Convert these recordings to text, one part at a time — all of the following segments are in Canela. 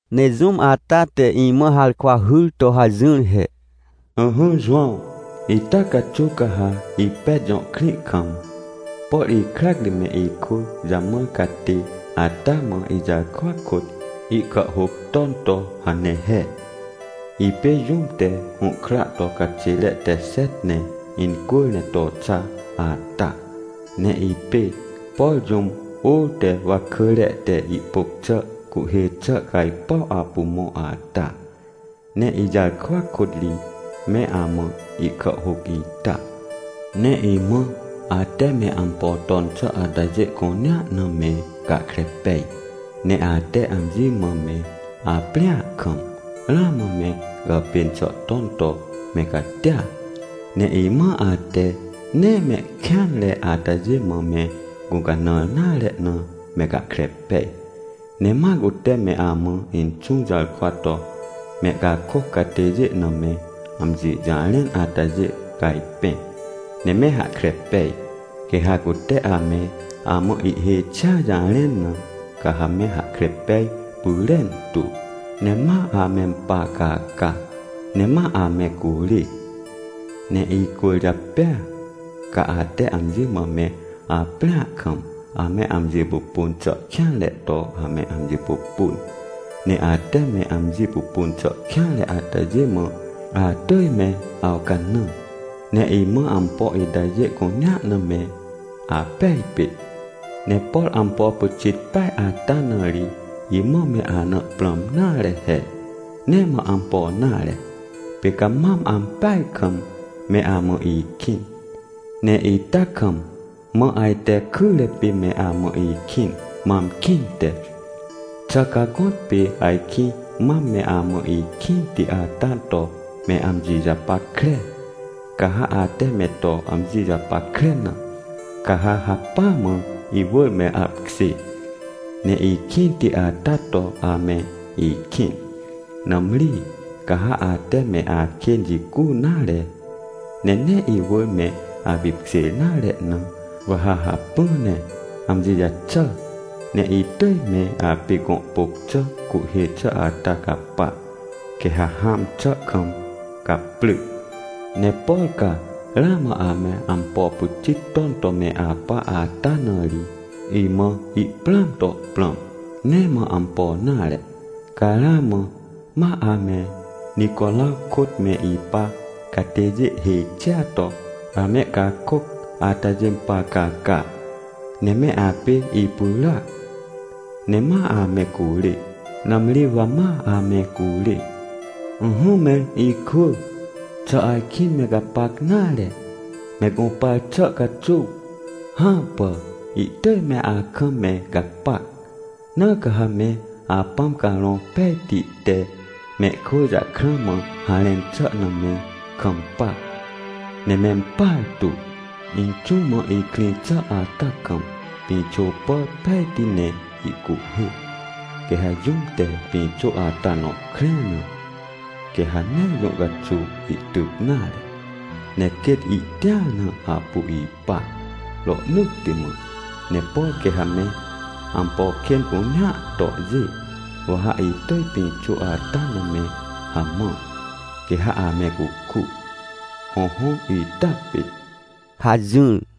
Ne jũm ata te imã harkwa hyr to hajỹr he: — Ỹhỹ Jowãw, ita caxuw ca ha Epet jõ krĩ kam, por ikrac ri me ikwỳ jamãr catê ata mã ijarkwa kôt, ihkàhhôc ton to hane he: — “Ipê jũm te hũhkra to caxêre te xet ne incwỳr ne to xa ata, ne ipê, por jũm ôr te wakỳre te ihpôc xà cuhhê xà cajpuw apu mõ ata. Ne ijarkwa kôt ri me amã ihkàhhôc ita. Ne imã ate me ampo ton xà atajê cunea na me gahkre pej. Ne ate amji mã me aprĩa kam, ramã me gàpên xà ton to me catia. Ne imã ate nee mehkêanre atajê mã me gũcanãr nare na me gahkre pej. Ne ma cute me amã Inxũ jarkwa to mehcakôc catêjê na me amji jarẽn atajê cajpẽ, ne me hahkre pej. Quê ha cute ame amã ihhêj xia jarẽn na, ca ha me hahkre pej pyrentu, ne ma amempar caca, ne ma ame curê. Ne icwỳrjapêa ca ate amji mã me aprĩa kam, ame amji pupun xà kêanre to ame amji pupun. Ne ate me amji pupun xà kêanre atajê mã atỳj me awcanã, ne imã ampo itajê cunea na me apej pit. “Ne por ampo pyxit peaj ata na ri imã me ana prãm nare he. Nee mã ampo nare, pê ca mam ampeaj kam me amã ikĩn, ne ita kam mã ajte kyre pê me amã ikĩn, mam kĩnte. Xà ca gõtpê ajkĩ mam me amã ikĩnti ata to me amji japackre? Ca ha ate me to amji japackre na, ca ha hacpỹa mã iwỳr me apkjê, ne ikĩnti ata to ame ikĩn. Nãmri, ca ha ate me akên jicu nare, ne nee iwỳr me apipkjêr nare na, wa ha hacpỹ ne amji jaxà, ne itỳj me apê gõ pôc xà cuhhê xà ata capa, quê ha hãm xà kam caprỳ. Ne por ca ramã ame ampo pyxit ton to me apa ata na ri, imã ihprãam to prãm. Nee mã ampo nare, ca ramã ma ame Nicoraw kôt me ipa catêjê hêj xia to amehcakôc atajê par caca, ne me apê ipyràac, ne ma ame curê. Nãmri wa ma ame curê. “Ỹhỹ me ikwỳ, xà ajkĩ me gapac nare, me gũpar xà caxuw? Hãpà. Ihtỳj me akam me gapac, na ca ha me Apãm Carõ Pejti te mehkwỳ jakrã mã harẽn xà na me kampa, ne mempartu. Inxũ mã ihkrĩ xà ata kam pĩxô pàr pejti ne ihcuhhê. Quê ha jũm te pĩxô ata nõ krẽr na, quê ha nee jũ caxuw ihtyc nare, ne quêt ihtĩar na apu ipa, rohnỳtti mã. Ne por quê ha me ampo kên cunea tohjê, wa ha itỳj pĩxô ata na me hamã, quê ha ame cuku. Hõhõ ita pit” — hajỹr.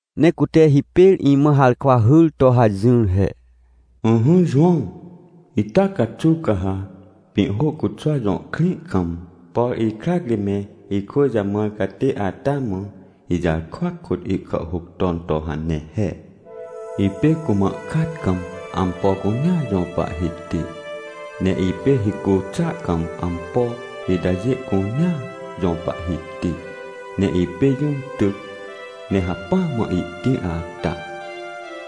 Ne cute hipêr imã harkwa hyr to hajỹr he: — Ỹhỹ Jowãw, ita caxuw ca ha Pĩhhôcuxwa jõ krĩ kam, por ikrac ri me ikwỳ jamãr catê ata mã ijarkwa kôt ihkàhhôc ton to hane he: — “Ipê cumã kat kam ampo cunea jõ Pahhiti, ne ipê hicu xàa kam ampo itajê cunea jõ Pahhiti. Ne ipê jũm tyc ne hacpỹa mã ihtĩr ata.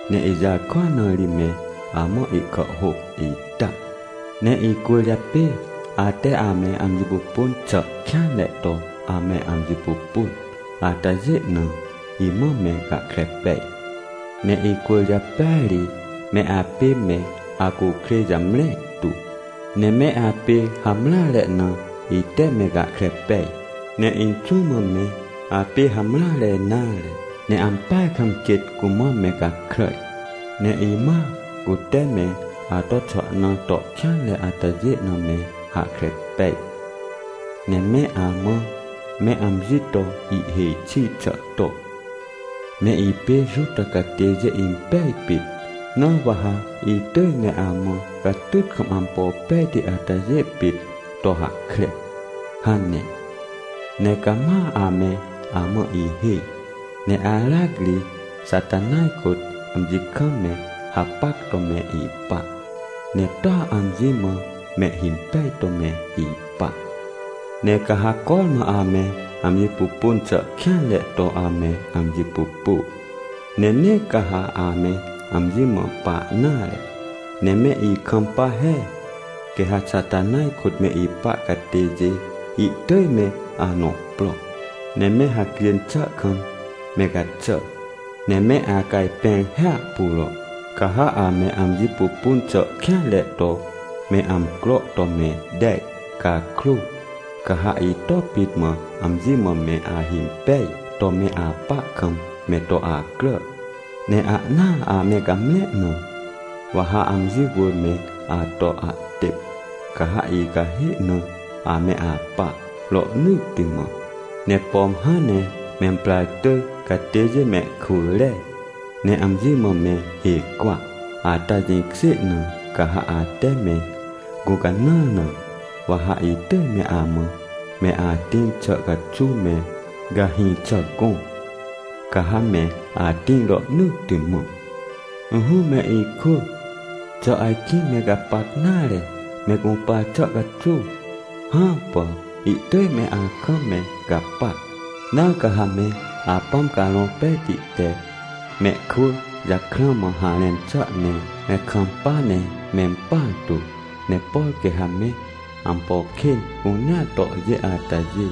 Ne ijarkwa na ri me amã ihkàhhôc ita. Ne icwỳrjapê ate ame amji pupun xà kêanre to ame amji pupun atajê na, imã me gahkre pej. Ne icwỳrjapêa ri me apê me acukrêj jamre tu, ne me apê hamreare na, ite me gahkre pej. Ne Inxũ mã me apê hamreare nare, ne ampeaj kam quêt cumã me gakràj. Ne imã cute me ato xwahna to kêanre atajê na me hahkre pej, ne me amã me amji to ihhêj xi xà to, ‘Me ipê Juta catêjê impej pit, na wa ha itỳj me amã catyt kam ampo pejti atajê pit to hahkre’ hane. Ne cama ame amã ihhêj, ne aracri Xatanaj kôt amji kam me hapac to me ipa, ne toa amji mã mehhimpej to me ipa. Ne ca ha cormã ame amji pupun xà kêanre to ame amji pupu, ne nee ca ha ame amji mã pa nare, ne me ikampa he. Quê ha Xatanaj kôt me ipa catêjê ihtỳj me anõ pro, ne me hacjên xà kam me gaxà, ne me acajpẽr hiahpuro. Ca ha ame amji pupun xà kêanre to me amcro to me tej cakrô, ca ha ito pit mã amji mã me ahimpej to me apa kam me to acrà, ne ahnaa ame gamre na, wa ha amji wỳr me ato ahtêp, ca ha icahê na ame apa, rohnỳtti mã. Ne pom hãn ne memprar tỳj catêjê mehkwỳ re, ne amji mã me hê cwa, ata jĩkjê na, ca ha ate me gũcanãr na, wa ha itỳj me amã me atĩr xà caxuw me gahĩ xà gõ, ca ha me atĩr rohnỳtti mã. “Ỹhỹ me ikwỳ, xà ajkĩ me gapac nare me gũpar xà caxuw? Hãpà! Ihtỳj me akam me gapac. Na ca ha me Apãm Carõ Pejti te mehkwỳ jakrã mã harẽn xà ne me kampa ne mempartu. Ne por quê ha me ampo kên cunea tohjê atajê,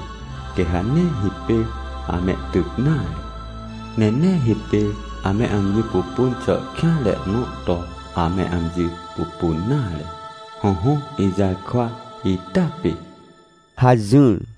quê ha nee hipêr amehtyc nare, ne nee hipêr ame amji pupun xà kêanre nõ to ame amji pupun nare. Hõhõ ijarkwa ita pit” — hajỹr.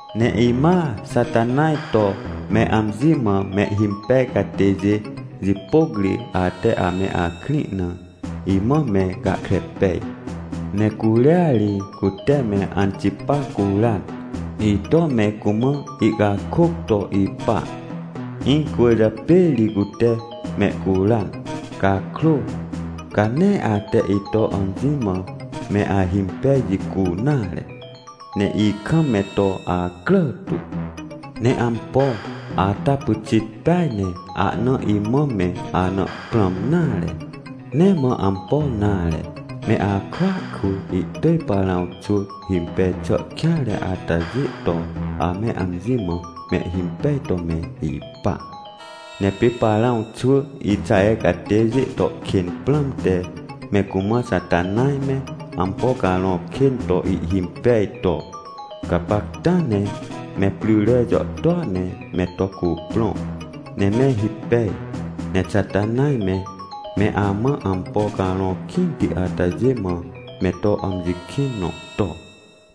Ne imã Xatanaj to me amji mã mehhimpej catêjê jipôc ri ate ame akrĩ na, imã me gahkre pej. Ne curia ri cute me Antipa curan. Ito me cumã ihcakôc to ipa, incwỳrjapê ri cute mehcuran cakrô, ca nee ate ito amji mã me ahimpej jicu nare, ne ikam me to acrà tu. “Ne ampo ata pyxit peaj ne ahna imã me ana prãm nare. Nee mã ampo nare, me akwỳa kwỳ ihtỳj Parãw xwỳ himpej xà kêanre atajê to ame amji mã mehhimpej to me ipa. Ne pê Parãw xwỳ Ixaher catêjê to kên prãmte me cumã Xatanaj me, ampo carõ kên to ihhimpej to: ‘Gapacta ne me pryre jàhtôa ne me to cuprõ ne me hipej, ne Xatanaj me, me amã ampo carõ kĩnti atajê mã me to amji kĩn nõ to,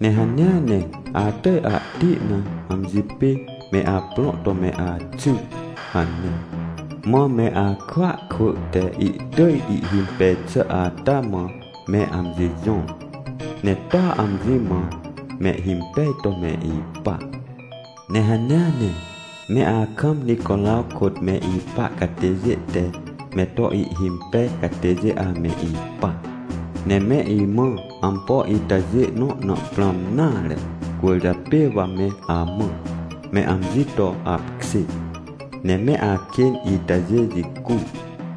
ne hanea ne atỳj ahti na amji pê me aprõ to me axy’ hane. Mã me akwỳa kwỳ te ihtỳj ihhimpej xà ata mã me amji jõr, ne toa amji mã mehhimpej to me ipa. Ne hanea ne me akam Nicoraw kôt me ipa catêjê te me to ihhimpej catêjê ame ipa. Ne me imã ampo itajê nõ na prãm nare. Cwỳrjapê wa me amã, ‘Me amji to apkjê, ne me akên itajê jicu.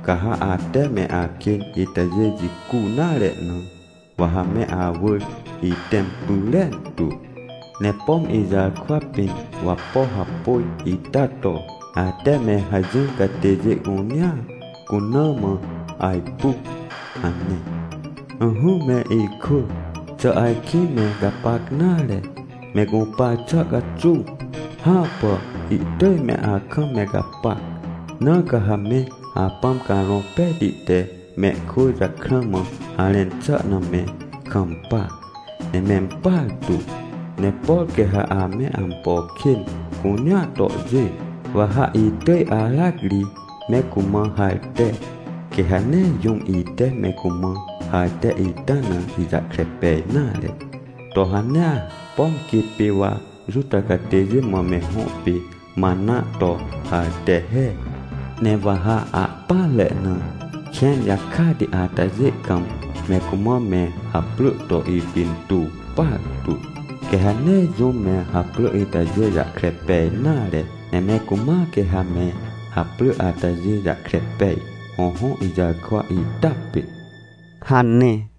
Ca ha ate me akên itajê jicu nare na, wa ha me awỳr itẽm pyrentu, ne pom ijarkwa pĩn wapo hapôj ita to, ate me hajỹr catêjê cunea cuna mã ajpu’ hane. “Ỹhỹ me ikwỳ, xà ajkĩ me gapac nare, me gũpar xà caxuw? Hãpà! Ihtỳj me akam me gapac. Na ca ha me Apãm Carõ Pejti te mehkwỳ jakrã mã harẽn xà na me kampa, ne mempartu. Ne por quê ha ame ampo kên cunea tohjê, wa ha itỳj aracri me cumã harte, quê ha nee jũm ite me cumã harte ita na ijahkre pej nare, to hanea, pom quê pê wa Juta catêjê mã me hõ pê mana to harte he. Ne wa ha ahpỹanre na kẽn jakati atajê kam me cumã me haprỳ to ipintuw partu. Quê ha nee jũm me haprỳ itajê jahkre pej nare, ne me cumãa quê ha me haprỳ atajê jahkre pej. Hõhõ ijarkwa ita pit” — hane.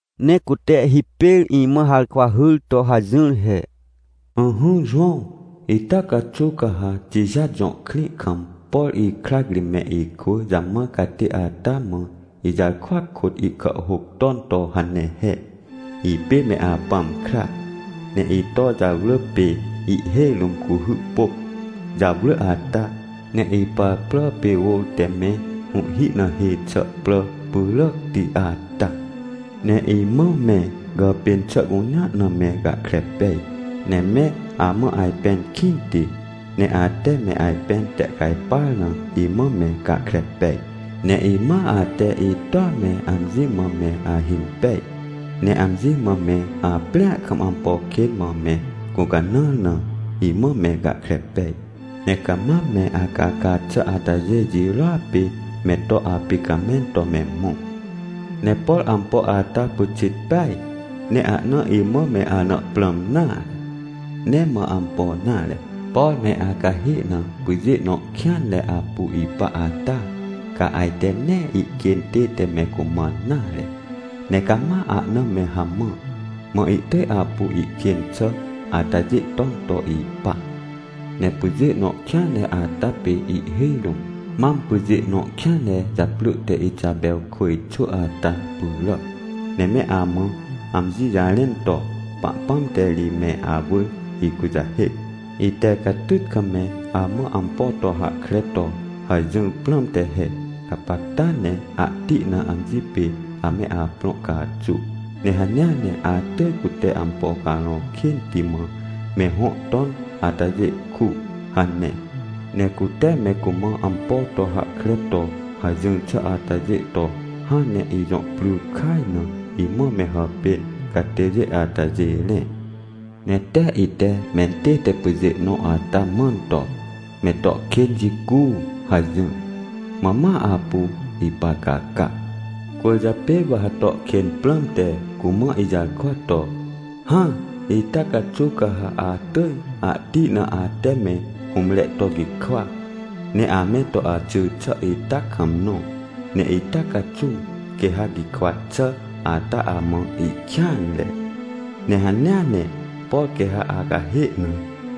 Ne cute hipêr imã harkwa hyr to hajỹr he: — Ỹhỹ Jowãw, ita caxuw ca ha Tijat jõ krĩ kam, por ikrac ri me ikwỳ jamãr catê ata mã ijarkwa kôt ihkàhhôc ton to hane he: — “Ipê me Apãm kra, ne ito jarwrỳ pê ihhêj rũm cuhy pôc jarwrỳ ata, ne ipar prà pê ôr te me hũhhi na hê xà prà pyràcti ata. Ne imã me gàpên xà cunea na me gahkre pej. Ne me amã ajpẽn kĩnti, ne ate me ajpẽn tehcajpar na, imã me gahkre pej. Ne imã ate itoa me amji mã me ahimpej, ne amji mã me aprĩa kam ampo kên mã me gũcanãr na, imã me gahkre pej. Ne ca mam me acaca xà atajê jirôa pê me to apicamẽn to me mõ. “Ne por ampo ata pyxit peaj, ne ahna imã me ana prãm nare. Nee mã ampo nare. Por me acahê na pyjê nõ kêanre apu ipa ata, ca ajte nee ihkên tête me cumãn nare, ne cama ahna me hamã. Mã ihtỳj apu ihkên xà atajê ton to ipa. Ne pyjê nõ kêanre ata pê ihhêj rũm mam pyjê nõ kêanre japrỳ te Ixapewkwỳj xwỳ ata pyràac, ne me amã amji jarẽn to, ‘Pahpãm te ri me awỳr ikujahêc, ite catyt kam me amã ampo to hahkre to hajỹr prãmte he. Gapacta ne ahti na amji pê ame aprõ caxu, ne hanea ne atỳj cute ampo carõ kênti mã me hõ ton atajê ku’ hane. Ne cute me cumã ampo to hahkre to hajỹr xà atajê to hãn ne ijõ pry kaj na imã me hàpên catêjê atajê rẽ. Ne tee ite mentête pyjê nõ ata mãn to, ‘Me to kên jicu!’ hajỹr. Mã ma apu ipar caca. “Cwỳrjapê wa ha to kên prãmte cumã ijarkwa to, ‘Hã, ita caxuw ca ha atỳj ahti na ate me hũmre to gikwa, ne ame to axỳ xà ita kam nõ. Ne ita caxuw quê ha gikwa xà ata amã ihkêanre, ne hanea ne, por quê ha acahê na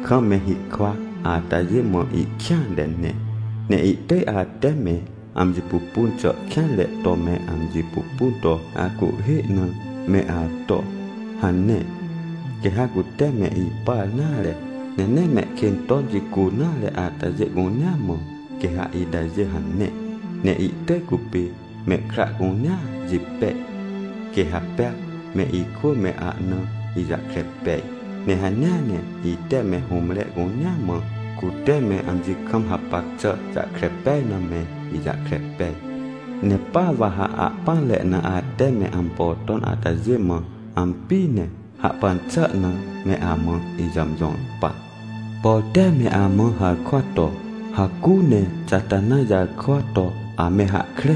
kam me hikwa atajê mã ihkêanre ne. Ne ihtỳj ate me amji pupun xà kêanre to me amji pupun to acuhhê na, me ato’ hane. Quê ha cute me ipar nare, ne nee mehkên ton jicu nare atajê cunea mã, quê ha itajê hane. Ne itỳj cupê mehkra cunea jipej. Quê ha pea me ikwỳ me ahna ijahkre pej, ne hanea ne ite me hũmre cunea mã cute me amji kam hapac xà jahkre pej na me ijahkre pej. Ne pa wa ha ahpỹanre na ate me ampo ton atajê mã ampi, ne hahpan xà na me amã ijàmjõr pa. “Por tee me amã harkwa to, ‘Hacu ne Xatanaj jarkwa to ame hahkre,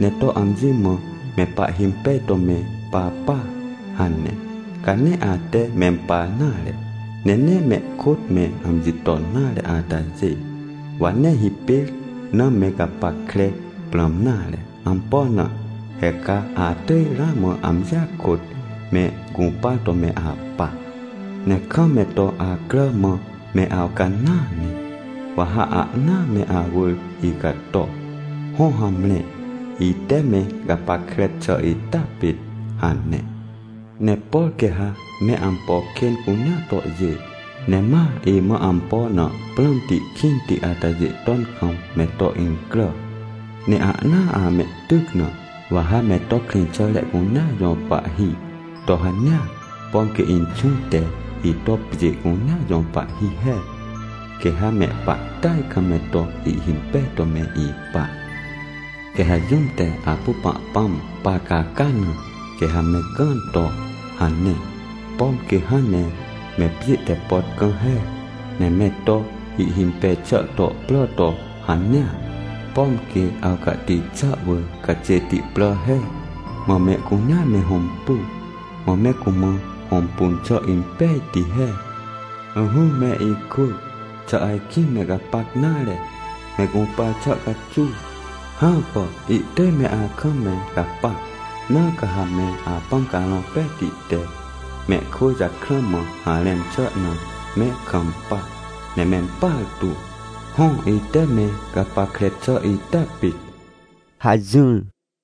ne to amji mã me pahhimpej to me papa’ hane. Ca nee ate mempar nare, ne nee mehkôt me amji ton nare atajê, wa nee hipêr na me gapackre prãm nare. Ampo na? He ca atỳj ramã amjia kôt me gũpar to me apa. Ne kam me to acrà mã me awcanãa ne, wa ha ahnaa me awỳr icato. Hõ, hamre, ite me gapackre xà ita pit” hane. — “Ne por quê ha me ampo kên cunea tohjê, ne ma imã ampo na prãmti kĩnti atajê ton kam me to incrà, ne ahnaa amehtyc na, wa ha me to krĩxàre cunea jõ pahhi to hanea, pom quê Inxũ te ito pjê cunea jõ Pahhi he. Quê ha mehpahtỳaj kam me to ihhimpej to me ipa. Quê ha jũm te apu Pahpãm par caca na, quê ha me gãn to hane, pom quê hãn ne me pjê te pot gã he. Ne me to ihhimpej xà to prà to hanea, pom quê awcahti xà wỳr caxêti prà he. Mã mehcunea me hõmpu, mã me cumã hõmpun xà impejti he. “Ỹhỹ me ikwỳ, xà ajkĩ me gapac nare, me gũpar xà caxuw? Hãpà! Ihtỳj me akam me gapac, na ca ha me Apãm Carõ Pejti te mehkwỳ jakrã mã harẽn xà na me kampa ne mempartu. Hõ, ite me gapackre xà ita pit” — hajỹr.